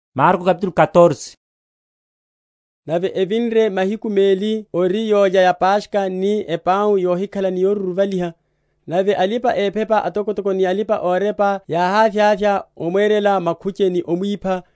Makhuche a alipa‐ephepa atokotoko. Nave evinre mahiku meli ori yólya ya Paskha ni epau yohikhala ni yoruruvaliha, nave alipa‐ephepa atokotoko ni alipa‐orepa yáhávyavya momwerela makhuche ni omwipha;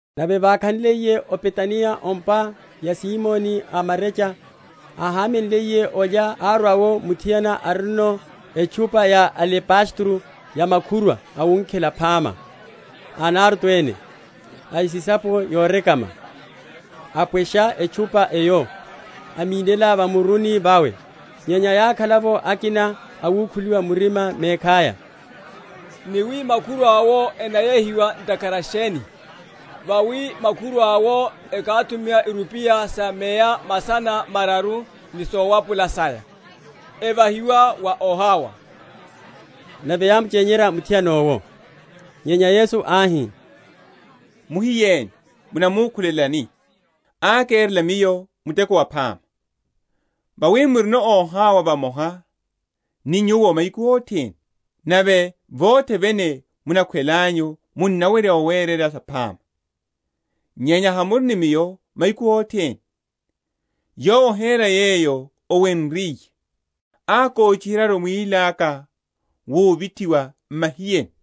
Nave vákhanliye o Betaniya o’mpa ya Simoni a marecha, áhamenliye olya, árwa’wo muthiana arino etchupa ya alebastero ya makhurwa awunkhela phama, a Nardo ene, a esisapo yorekama; apwesha etchupa eyo, amínela va muruni vawe. Nyenya yákhala’vo akina awukhuliwa murima mekhaya, ni wi makhurwa’wo enayehiwa ntakhara sheni? Vawi makhurwa’wo ekáthuma irupiya sa meya masana mararu ni sowapula saya, evahiwa wa óhawa. Nave yámuchenyerya muthiana owo. Nyenya Yesu áhi, Muhiyeni, munamukhulelani? ákerela Miyo muteko waphama. Vawi murino óhawa vamoha ni nyuwo mahiku othene, nave vothe vene munakhwelelanyu munawerya owerela saphama; nyenya hamuri ni Miyo mahiku othene. Yowo ohera yeyo owenryiye; ákochiheryaru mwíli aka wuvithiwa m’mahiyeni.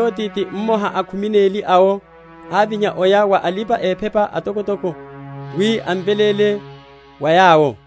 Nave Yudase Isikariote, ti mmoha a khumi neli awo, ávinya, aya wa alipa‐ephepa atokotoko, wi amveléle wa yawo.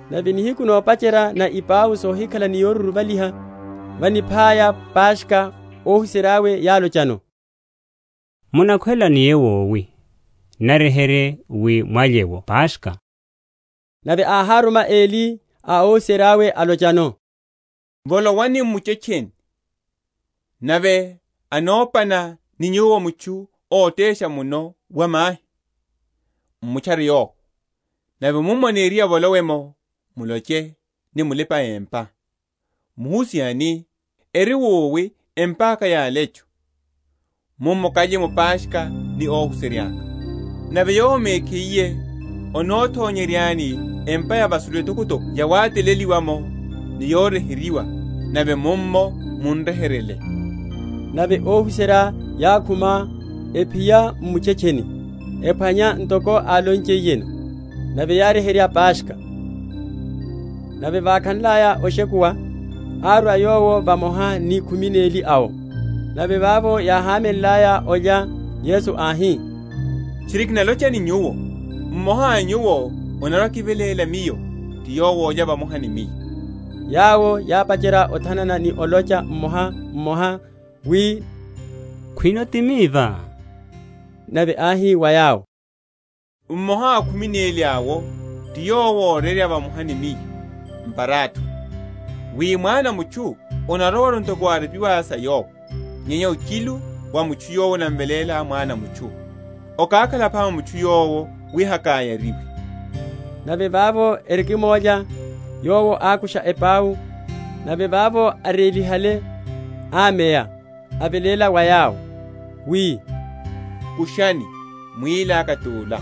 Nave nihiku nopacherya na ipau sohikhala ni yoruruvaliha, vaniphaya Paskha, óhuserya’we yálochano, Munakhwela niye wowi, naryeherye wi mwalye’wo Paskha? Nave áháruma eli a óhuserya’we, alochano, Volowani m’muchetcheni, nave anopana ni nyuwo mutchu ótesha muno wa mahi; m’mutchare yowo, nave mummo aniriye avolowe’mo, muloche ni mulipa‐empa, Muhusiha ani, Eri wowi empa’ka ya alecho? mummo kalye’mo Paskha ni óhuserya’ka. Nave yowo mekhiye anothonyeryani empa ya vasulu etokotoko yawataleliwa’mo ni yoryeheryiwa; nave mummo mun’ryeheryele. Nave óhuserya yákhuma, ephiya m’muchetcheni, ephwanya ntoko álonchiyeno; nave yáryeherya Paskha. Mukonelo wa Apwiya. Nave vákhanlaya oshekuwa, árwa Yowo vamoha ni khumi neli awo. Nave vavo yáhamenlaya olya, Yesu áhi, Tchiri kinalocha ni nyuwo, mmoha a nyuwo anarwa‐akiveléla Miyo, ti yowo olya vamoha ni Miyo. Yawo yápacherya othanana ni olocha mmoha mmoha wi, Khwino ti miva? Nave áhi wa yawo, Mmoha a khumi neli awo, ti yowo órerya vamoha ni Miyo m’parathoni. Wi Mwana a mutchu anarowaru ntoko morepiwa sa Yowo; nyenya ochilu wa mutchu yowo anamveléla Mwana a mutchu. Okákhala phama wa mutchu yowo wi hakáyariwe. Nave vavo erikimólya, Yowo ákusha epau, nave vavo arélihale, ámeya, aveléla wa yawo, wi, Kushani; mwíli aka tula.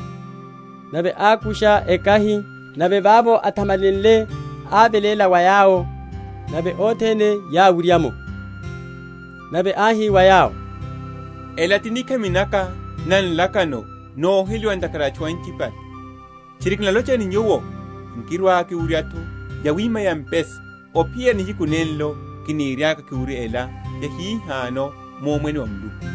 Nave ákusha ekahi, nave vavo athamalenle, áveléla wa yawo; nave othene yáwurya’mo. Nave áhi wa yawo, Ela ti nikhami naka na nlakano, noheliwa ntakhara a atchu anchipale. Tchiri kinalocha ni nyuwo, Nkirwa‐kiwurya’tho yawima ya mpesa, ophiyerya nihiku nenlo kiniriaka kiwurye ela yahihano mu Omwene wa Muluku.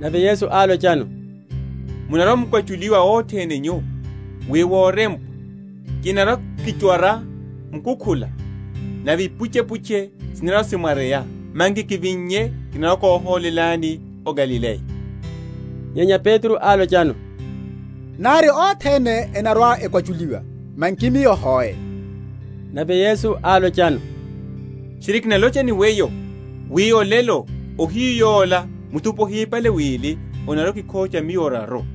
Nave Yesu álochano, Munarwa‐mukwachuliwa othene nyu, wi worempwa. Kinarwa‐kichwara mukukhula, nave ipuchepuche sinarwa‐simwareya. Manki kivinnye, kinarwa‐kóhólelani o Galileya. Nyenya Petro álochano, Nari othene enarwa‐ekwachuliwa, manki miyo hoe. Nave Yesu álochano, Tchiri kinalocha ni weyo, wi olelo, ohiyu yola, muthupi ohipale wili, onarwa‐okikhocha Miyo oraru.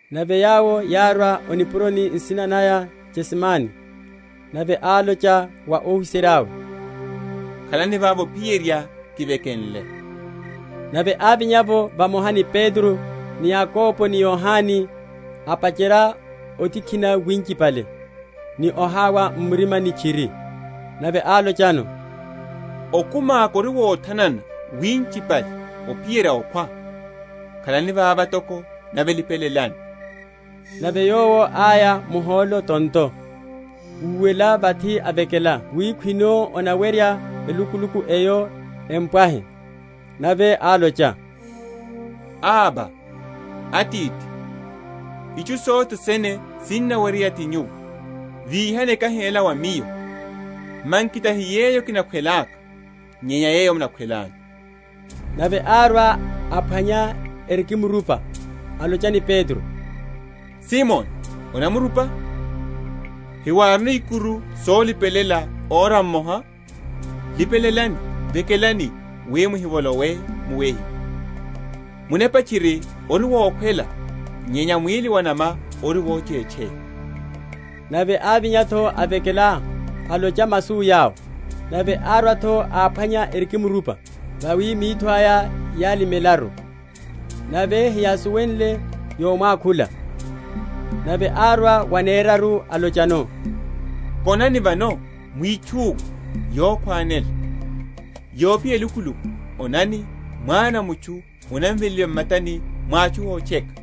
Nave yawo yárwa o nipuroni, nsina naya Getsemane; nave álocha wa óhuserya’we, Khalani vava ophiyerya kivekenle. Nave ávinya’vo vamoha ni Petro, ni Yakobo ni Yohane, apacherya otikhina winchipale ni ohawa m’murima tchiri. Nave álochano, Okumi aka ori wothanana winchipale, ophiyerya okhwa. Khalani vava toko nave lipelelani. Nave Yowo áya muhólo tonto, úwela vathi, avekela wi, Khwino onaweryeya, elukuluku eyo empwahe. Nave álocha, Abba, Atithi, Itchu sothe sene sinaweryeya ti Nyuwo; Víhani ekahi ela wa Miyo; manki tahi yeyo kinakhwelaka, nyenya yeyo munakhwelanyu. Nave árwa, áphwanya erikimrupa, alocha ni Petro, Simoni, onamrupa? hewárino ikuru solipelela ora mmoha? Lipelelani, vekelani, wi muhivolowe mu wehiwa; munepa tchiri ori wokhwela, nyenya mwíli wa’nama ori wochetcheya. Nave ávinya’tho, avekela, alocha masu yawo. Nave árwa’tho áphwanya erikimrupa, vawi mitho aya yálimelaru; nave heyásuwenle yomwakhula. Nave árwa waneraru, alochano, Konani vano, mwitchuwe; yokhwanela; yophiya elukuluku; onani Mwana a mutchu anaveléliwa m’matani mwa atchu ótcheka.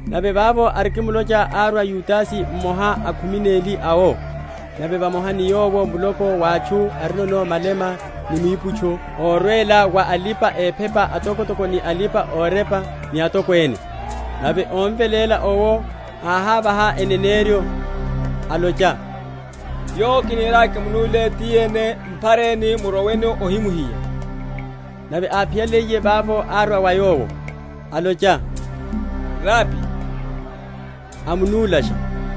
Nave vavo, arikimlocha, árwa Yudase, mmoha a khumi neli awo, nave vamoha ni yowo muloko wa atchu arino malema ni miuputcho órwela wa alipa‐ephepa atokotoko ni alipa‐orepa ni atokwene. Nave ómveléla owo áhávaha eneneryo, alocha, Yowo kiniriaka kimunúle, ti yene; m’phareni, muroweno, óhimuhiya. Nave áphiyaliye, vavo árwa wa Yowo, alocha, Rabi; amunúlasha.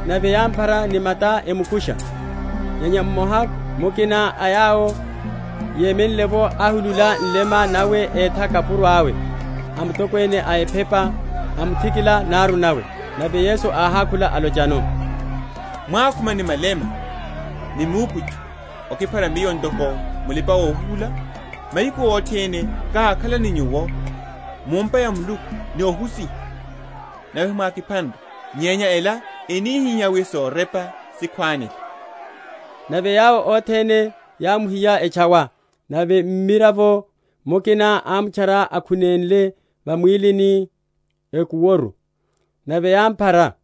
Nave yámphara ni mata emukusha. Nyenya mmoha mukina a yawo yemenle’vo, áhulula nlema nawe, étha kapuro awe a mutokwene a ephepa, amuthikila naru nawe. Nave Yesu áhákhula, alochano, Mwákhuma ni malema ni miuputcho okiphara Miyo ntoko mulipa‐ohuhula? Mahiku othene kákhala ni nyuwo mu’mpa ya Muluku ni ohusiha, nave hemwákiphanre; nyenya ela enihihá wi sorepa sikhwánele. Nave yawo othene yámuhiya, etchawa. Nave mmiravo mukina ámutchara, akhunenle va mwílini ekuworu; nave yámphara;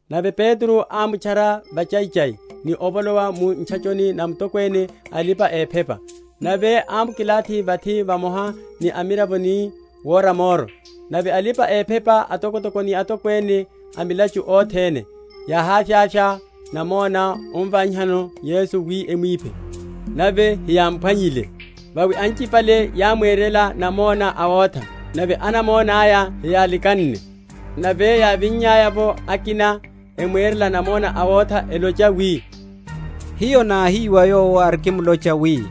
Nave Petro ámutchara vachaichai, ni ovolowa mu ntchachoni na mutokwene a alipa‐ephepa; nave ámukilathi vathi vamoha ni amiravo ni wora moro. Nave alipa‐ephepa atokotoko ni atokwene a milachu othene, yáhavyavya namona ómvanyihano Yesu wi emwiphe; nave heyámphwanyile. Vawi anchipale yámwerela namona awotha nave anamona’ya heyálikanne. Nave yávinya’vo akina, emwerela namona awotha, elocha wi, Hiyo náhiwa Yowo arikimlocha wi,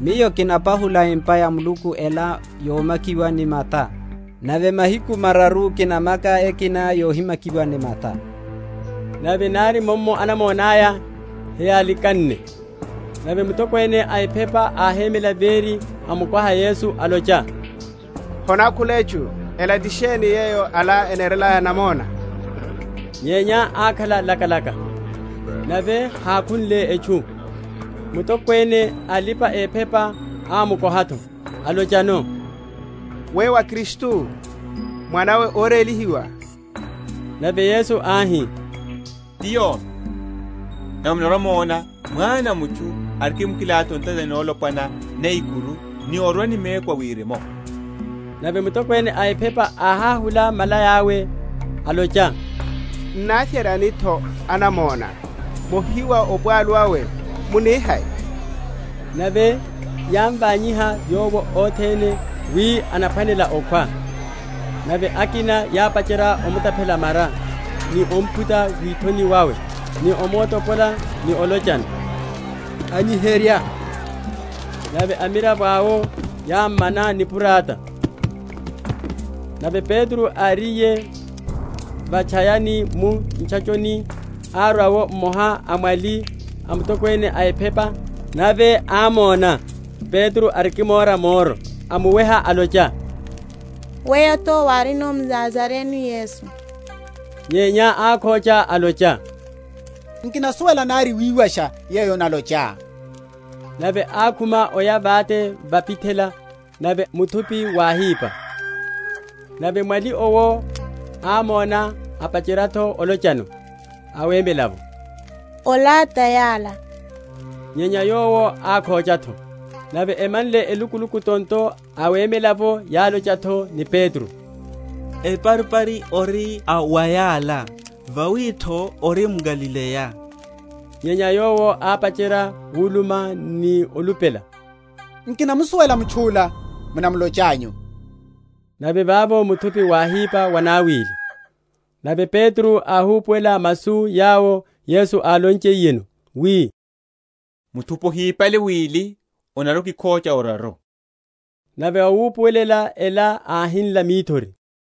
Miyo kinapahula empa ya Muluku ela yomakiwa ni mata, nave mahiku mararu kinamaka ekina yohimakiwa ni mata. Nave nari mummo anamona’ya heyálikanne. Nave mutokwene a ephepa áhémela véri, amukoha Yesu, alocha, Honákhula etchu? Ela ti sheni yeyo ala eherelaya namona? Nyenya ákhala lakalaka nave hákhunle etchu. Mutokwene a alipa‐ephepa ámukoha’tho, alochano, Weyo wá Kristu, Mwanawe a Órélihiwa? Nave Yesu áhi, Ti yomi; nave munarwa‐mona Mwana a mutchu arikimkilathi o ntatani nolopwana na ikuru ni orwa ni meku a wirimu. Nave mutokwene a ephepa áháhula malaya’we, alocha, N’navyeryani’tho anamona? Mohiwa opwalu awe; muni hai? Nave yámvanyiha Yowo othene wi anaphwanela okhwa. Nave akina yápacherya omutaphela mara, ni omphuta withoni wawe, ni omuotopola, ni olochano, Anyiherya; nave amiravo awo yámmana nipurata. Okhocha wa Petro. Nave Petro áriye va’tchayani mu ntchachoni, árwa’wo mmoha a amwali a mutokwene a ephepa; nave ámona Petro arikimora moro, amuweha, alocha, Weyo’tho wárino mNazarene Yesu. Nyenya ákhocha, alocha, Nkinasuwela nari wiwasha yeyo onalochá; nave ákhuma oya vate va’pithela; nave muthupi wáhipa. Nave mwali owo ámona, apacherya’tho olochano awemelela’vo. Ola ta yala. Nyenya yowo ákhocha’tho. Nave emanle elukuluku tonto, awemela’vo yálocha’tho ni Petro, Eparipari ori a wa yala; vawi’tho ori mGalileya. Nyenya yowo ápacherya wulumela ni olupela, Nkinamusuwela mutchu’la munamulochanyu. Nave vavo muthupi wáhipa wanawili. Nave Petro áhupuwela masu yawo Yesu álonchiyeno wi, Muthupi ohipale wili, onarwa‐okikhocha oraru. Nave vawupuwelela ela, áhinla mithori.